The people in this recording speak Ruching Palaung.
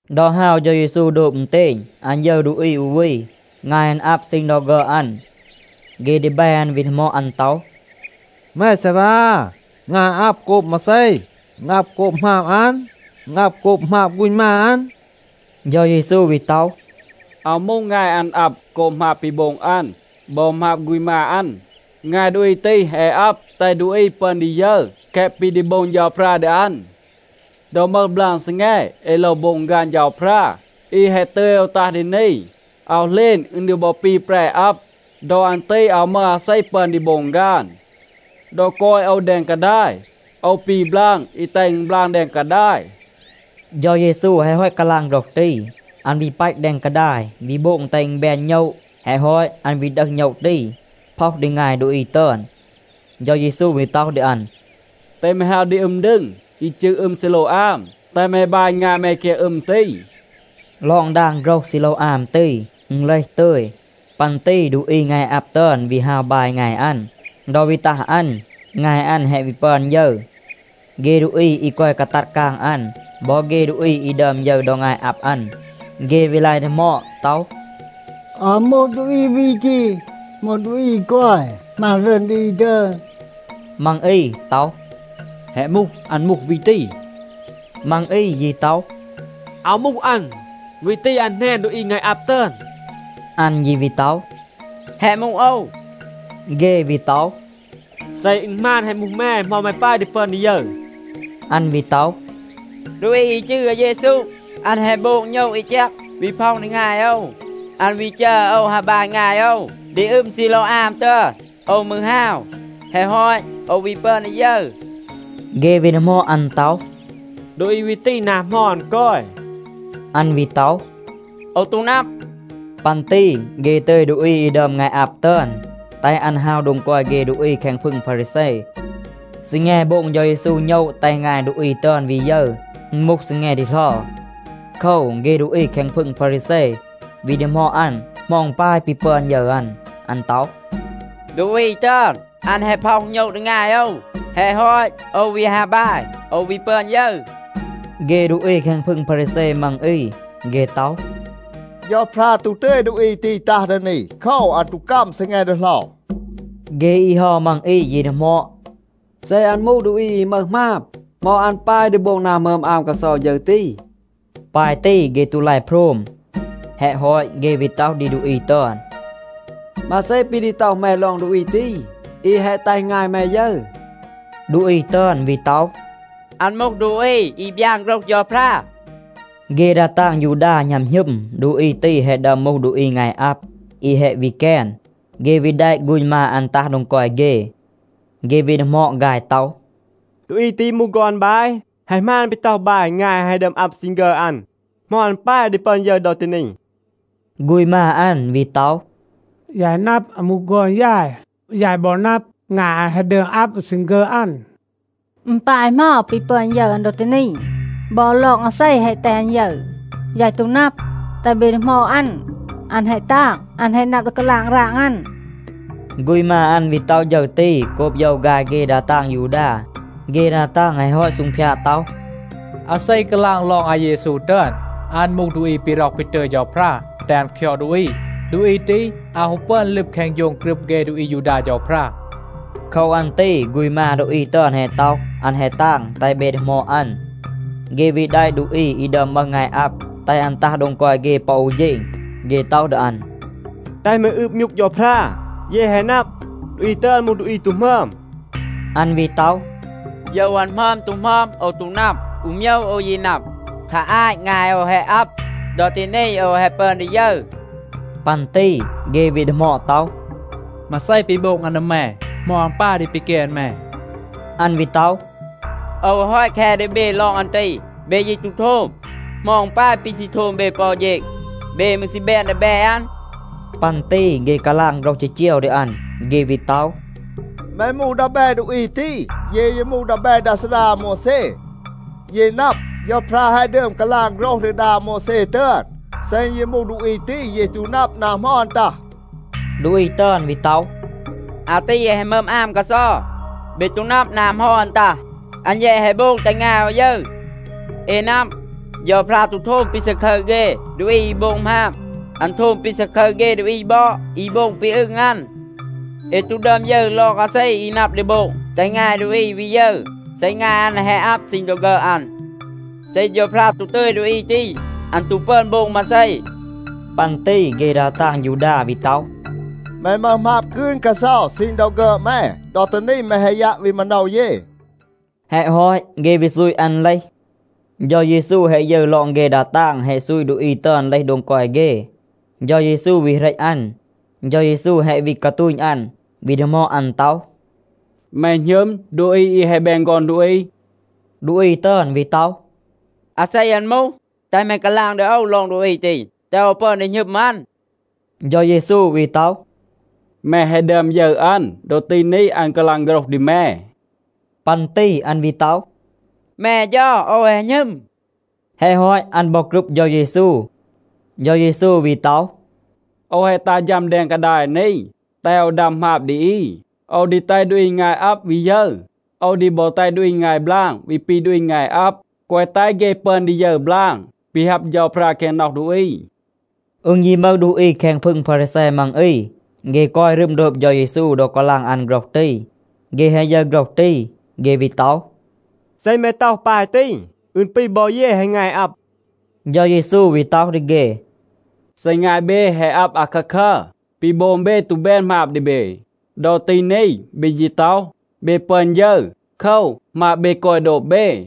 ดอ ฮาว เฌา เยซู โดบ อึณเตณ, อัน ยึร ดูอี อู วี, งาย อัน อับ ซีณ ดอ ฆึอด อัน. เฆ ดีแบ อัน วี ดีหมอด อัน ต็อห, “แม ซารา, งาย อัน อับ โกบ มาเซ? อึณ อับ โกบ หมาบ อัน? อึณ อับ โกบ หมาบ ฆูณ มา อัน?” เฌา เยซู วี ต็อห, “อาว มูห งาย อัน อับ โกบ หมาบ ปี โบง อัน บอ หมาบ ฆูณ มา อัน. งาย ดูอี ตี แฮะ อับ แตห ดูอี ปึอน ดี ยึร แคะ ปี ดี โบง เฌาพรา ดี อัน. ดอ มึห บลาง ซีแง, เอ โลว โบง ฆาน เฌาพรา, อี แฮะ ตึย โอว ตัห ดี นี. อาว เหลณ อึณ ดี บอ ปี แปร อับ. ดอ อัน ตี อาว มึห อาเซ ปึอน ดี โบง ฆาน. ดอ กอย โอว แดง กาดาย, โอว ปี บลาง อี แตห อึณ บลาง แดง กาดาย.” เฌา เยซู แฮะ ฮอต กาลาง โฆรห ตี, อัน วี ปัต แดง กาดาย, วี โบง แตห อึณ แบน โณะ. แฮะ ฮอต, อัน วี ดึห โณะ ตี, พ็อห ดี งาย ดูอี ตึอน. เฌา เยซู วี ต็อห ดี อัน, “แตห แม ฮาว ดี อึม ดึง อี จืร อึม ซีโลวอาม, แตห แม บาย งาย แม แคง อึม ตี.” (ลอง ดาง โฆรห “ซีโลวอาม” ตี, อึณ เลห “ตึย”). ปัน ตี ดูอี งาย อับ ตึอน วี ฮาว บาย งาย อัน. ดอ วี ตัห อัน, งาย อัน แฮะ วี ปึอน ยึร. เฆ ดูอี อี กอย กาตัด กาง อัน บอ เฆ ดูอี อี ดึอม ยึร ดอ งาย อับ อัน, เฆ วี ลาย ดีหมอด ต็อห, “อาว มูห, ดูอี วี ตี มูห ดูอี อี กอย หมาณ รึอน ดี อี ตึอน?” มัง อี ต็อห, “แฮะ มูห. อัน มูห วี ตี.” มัง อี ยี ต็อห, “อาว มูห อัน. วี ตี, อัน แหนน ดูอี งาย อับ ตึอน.” อัน ยี วี ต็อห, “แฮะ มูห โอว.” เฆ วี ต็อห, “เซ อึณ หมาน แฮะ มูห แม, เหมา แม ปาย ดี ปึอน ดี ยึร?” อัน วี ต็อห, “ดูอี อี จืร อาเยซู, อัน แฮะ โบง โณะ อี แจก, วี พ็อห ดี งาย โอว. อัน วี จัร โอว ฮาว บาย งาย โอว ดี อึม ซีโลวอาม ตึอน, โอว มืร ฮาว. แฮะ ฮอต, โอว วี ปึอน ดี ยึร.” เฆ วี ดีหมอด อัน ต็อห, “ดูอี วี ตี, นา เหมา อัน กอย?” อัน วี ต็อห, “โอว ตู นับ.” ปัน ตี เฆ ตึย ดูอี อี ดึอม งาย อับ ตึอน, แตห อัน ฮาว โดง กอย เฆ ดูอี แคง พึง พารีแซ. ซีแง โบง เฌา เยซู โณะ แตห งาย ดูอี ตึอน วี ยึร, อึณ มูห ซีแง ดีเหลา. โคว, เฆ ดูอี แคง พึง พารีแซ วี ดีหมอด อัน, เหมา อึณ ปาย ปี ปึอน ยึร อัน. อัน ต็อห, “ดูอี ตึอน, อัน แฮะ พ็อห โณะ ดี งาย โอว. แฮะ ฮอต, โอว วี ฮาว บาย, โอว วี ปึอน ยึร.” เฆ ดูอี แคง พึง พารีแซ มัง อี, เฆ ต็อห, “เฌาพรา ตู ตึย ดูอี ตี ตัห ดี นี. โคว, อัน ตู กัม ซีแง ดีเหลา.” เฆ อี เฮา มัง อี ยี ดีหมอด, “เซ อัน มูห ดูอี อี มึห หมาบ, เหมา อัน ปาย ดี โบง นา หมึอม อาม กาเซา ฌึร ตี?” ปาย ตี เฆ ตู ลาย โพรม. แฮะ ฮอต, เฆ วี ต็อห ดี ดูอี ตึอน, “มาเซ ปี ดี ต็อห แม ลอง ดูอี ตี, อี แฮะ แตห งาย แม ยึร?” ดูอี ตึอน วี ต็อห, “อัน มูห ดูอี อี บยาน โฆรห เฌาพรา.” เฆ ดา ตาง ยูดา หณัม หณึม, ดูอี ตี แฮะ ดึอม มูห ดูอี งาย อับ อี แฮะ วี แกน. เฆ วี แดะ ฆูณ มา อัน ตัห โดง กอย เฆ. เฆ วี ดีหมอด ฆาย ต็อห, “ดูอี ตี มูห ฆอน บาย? แฮะ หมาน, ปี ต็อห บาย, งาย อัน แฮะ ดึอม อับ ซีณ ฆึอด อัน? เหมา อัน ปาย ดี ปึอน ยึร ดอ ตี นี?” ฆูณ มา อัน วี ต็อห, “ยาย นับ, อัน มูห ฆอน ยาย. ยาย บอ นับ, งาย อัน แฮะ ดึอม อับ ซีณ ฆึอด อัน. อึณ ปาย เหมา ปี ปึอน ยึร อัน ดอ ตี นี บอ, ลอง อาเซ แฮะ แตห อัน ยึร, ยาย ตู นับ. แตห เบ ดีหมอด อัน. อัน แฮะ ตาง. อัน แฮะ นับ ดี กาลาง ราง อัน.” ฆูณ มา อัน วี ต็อห ฌึร ตี โกบ โยว ฆาย เฆ ดา ตาง ยูดา. เฆ ดา ตาง แฮะ ฮอต ซูงพยาด ต็อห, “อาเซ กาลาง ลอง อาเยซู ตึอน, อัน มูห ดูอี ปี ร็อห ปี ตึย เฌาพรา แตห อัน คยอด ดูอี, ดูอี ตี อาว ฮู ปึอน ลึบ แคง โฌง กรึบ เฆ ดูอี อายูดา เฌาพรา.” โคว อัน ตี ฆูณ มา ดูอี ตึอน แฮะ ต็อห, “อัน แฮะ ตาง. แตห เบ ดีหมอด อัน.” เฆ วี แดะ ดูอี อี ดึอม มึห งาย อับ, แตห อัน ตัห โดง กอย เฆ ปอ อู เฌณ. เฆ ต็อห ดี อัน, “แตห แม อืบ มยูก เฌาพรา. เย แฮะ นับ, ดูอี ตึอน มูห ดูอี ตู หมึอม.” อัน วี ต็อห, “โยว อัน หมึอม ตู หมึอม, โอว ตู นับ. อู โมยว โอว ยี นับ. คา อาต งาย โอว แฮะ อับ. ดอ ตี นี โอว แฮะ ปึอน ดี ยึร.” ปัน ตี เฆ วี ดีหมอด ต็อห, “มาเซ ปี โบง อัน ดี แม? เหมา อัน ปาย ดี ปีแกน แม?” อัน วี ต็อห, “โอว แฮะ ฮอต แค ดี เบ ลอง อัน ตี. เบ ยี ตู โทม. เหมา อึณ ปาย ปี ซี โทม เบ ปอ อู เฌณ? เบ มืร ซี แบน ดีแบ อัน?” ปัน ตี เฆ กาลาง โฆรห จีจีว ดี อัน. เฆ วี ต็อห, “แม มูห ดีแบ ดูอี ตี. เย ยี มูห ดีแบ ดา ซารา อาโมวแซ. เย นับ, เฌาพรา แฮะ ดึอม กาลาง โฆรห ดี ดา อาโมวแซ ตึอน. เซ อึณ ยี มูห ดูอี ตี, เย ตู นับ นา เหมา อัน ตัห.” ดูอี ตึอน วี ต็อห, “อาตี แฮะ หมึอม อาม กาเซา. เบ ตู นับ นา เหมา อัน ตัห. อัน แยะ แฮะ โบง แตห งาย โอว ยึร. เอ นับ, เฌาพรา ตู โทม ปี ซาคึร เฆ ดูอี อี โบง หมาบ. อัน โทม ปี ซาคึร เฆ ดูอี บอด อี โบง ปี อึง อัน. เอ ตู ดึอม ยึร ลอง อาเซ อี นับ ดี โบง แตห งาย ดูอี วี ยึร, เซ งาย อัน แฮะ อับ ซีณ ดอ ฆึอด อัน. เซ เฌาพรา ตู ตึย ดูอี ตี, อัน ตู ปึอน โบง มาเซ.” ปัน ตี เฆ ดา ตาง ยูดา วี ต็อห, “แม มึห หมาบ กืน กาเซา ซีณ ดอ ฆึอด แม. ดอ ตี นี แม แฮะ ยัะ วี มาโนว เย.” แฮะ ฮอต, เฆ วี ซูต อัน เลห. เฌา เยซู แฮะ ยึร ลอง เฆ ดา ตาง แฮะ ซูต ดูอี ตึอน เลห โดง กอย เฆ, เฌา เยซู วี เหรต อัน. เฌา เยซู แฮะ วี กาตูณ อัน, วี ดีหมอด อัน ต็อห, “แม หณึม ดูอี อี แฮะ แบน ฆอน ดูอี?” ดูอี ตึอน วี ต็อห, “อาเซ อัน มูห? แตห แม กาลาง ดี โอว ลอง ดูอี ตี, แตห โอว ปึอน ดี หณึม อัน.” เฌา เยซู วี ต็อห, “แม แฮะ ดึอม ยึร อัน. ดอ ตี นี อัน กาลาง โฆรห ดี แม.” ปัน ตี อัน วี ต็อห, “แม เฌา, โอว แฮะ หณึม.” แฮะ ฮอต, อัน บอ กรึบ เฌา เยซู. เฌา เยซู วี ต็อห, “โอว แฮะ ตัห ฌัม แดง กาดาย นี, แตห โอว ดัม หมาบ ดี อี. โอว ดี แตห ดูอี งาย อับ วี ยึร, โอว ดี บอ แตห ดูอี งาย บลาง วี ปี ดูอี งาย อับ, แกวะ แตห เฆ ปึอน ดี ยึร บลาง, ปี ฮับ เฌาพรา แคง น็อห ดูอี.” อึณ ยี มึห ดูอี แคง พึง พารีแซ มัง อี, เฆ กอย รึม โดบ เฌา เยซู ดอ กาลาง อัน โฆรห ตี. เฆ แฮะ ยึร โฆรห ตี, เฆ วี ต็อห, “เซ แม ต็อห ปาย ตี, อึณ ปี บอ เย แฮะ งาย อับ.” เฌา เยซู วี ต็อห ดี เฆ, “เซ งาย เบ แฮะ อับ อาคาคัร, ปี โบง เบ ตู แบน หมาบ ดี เบ. ดอ ตี นี, เบ ยี ต็อห, เบ ปึอน ยึร. โคว, หมาบ เบ กอย โดบ เบ.”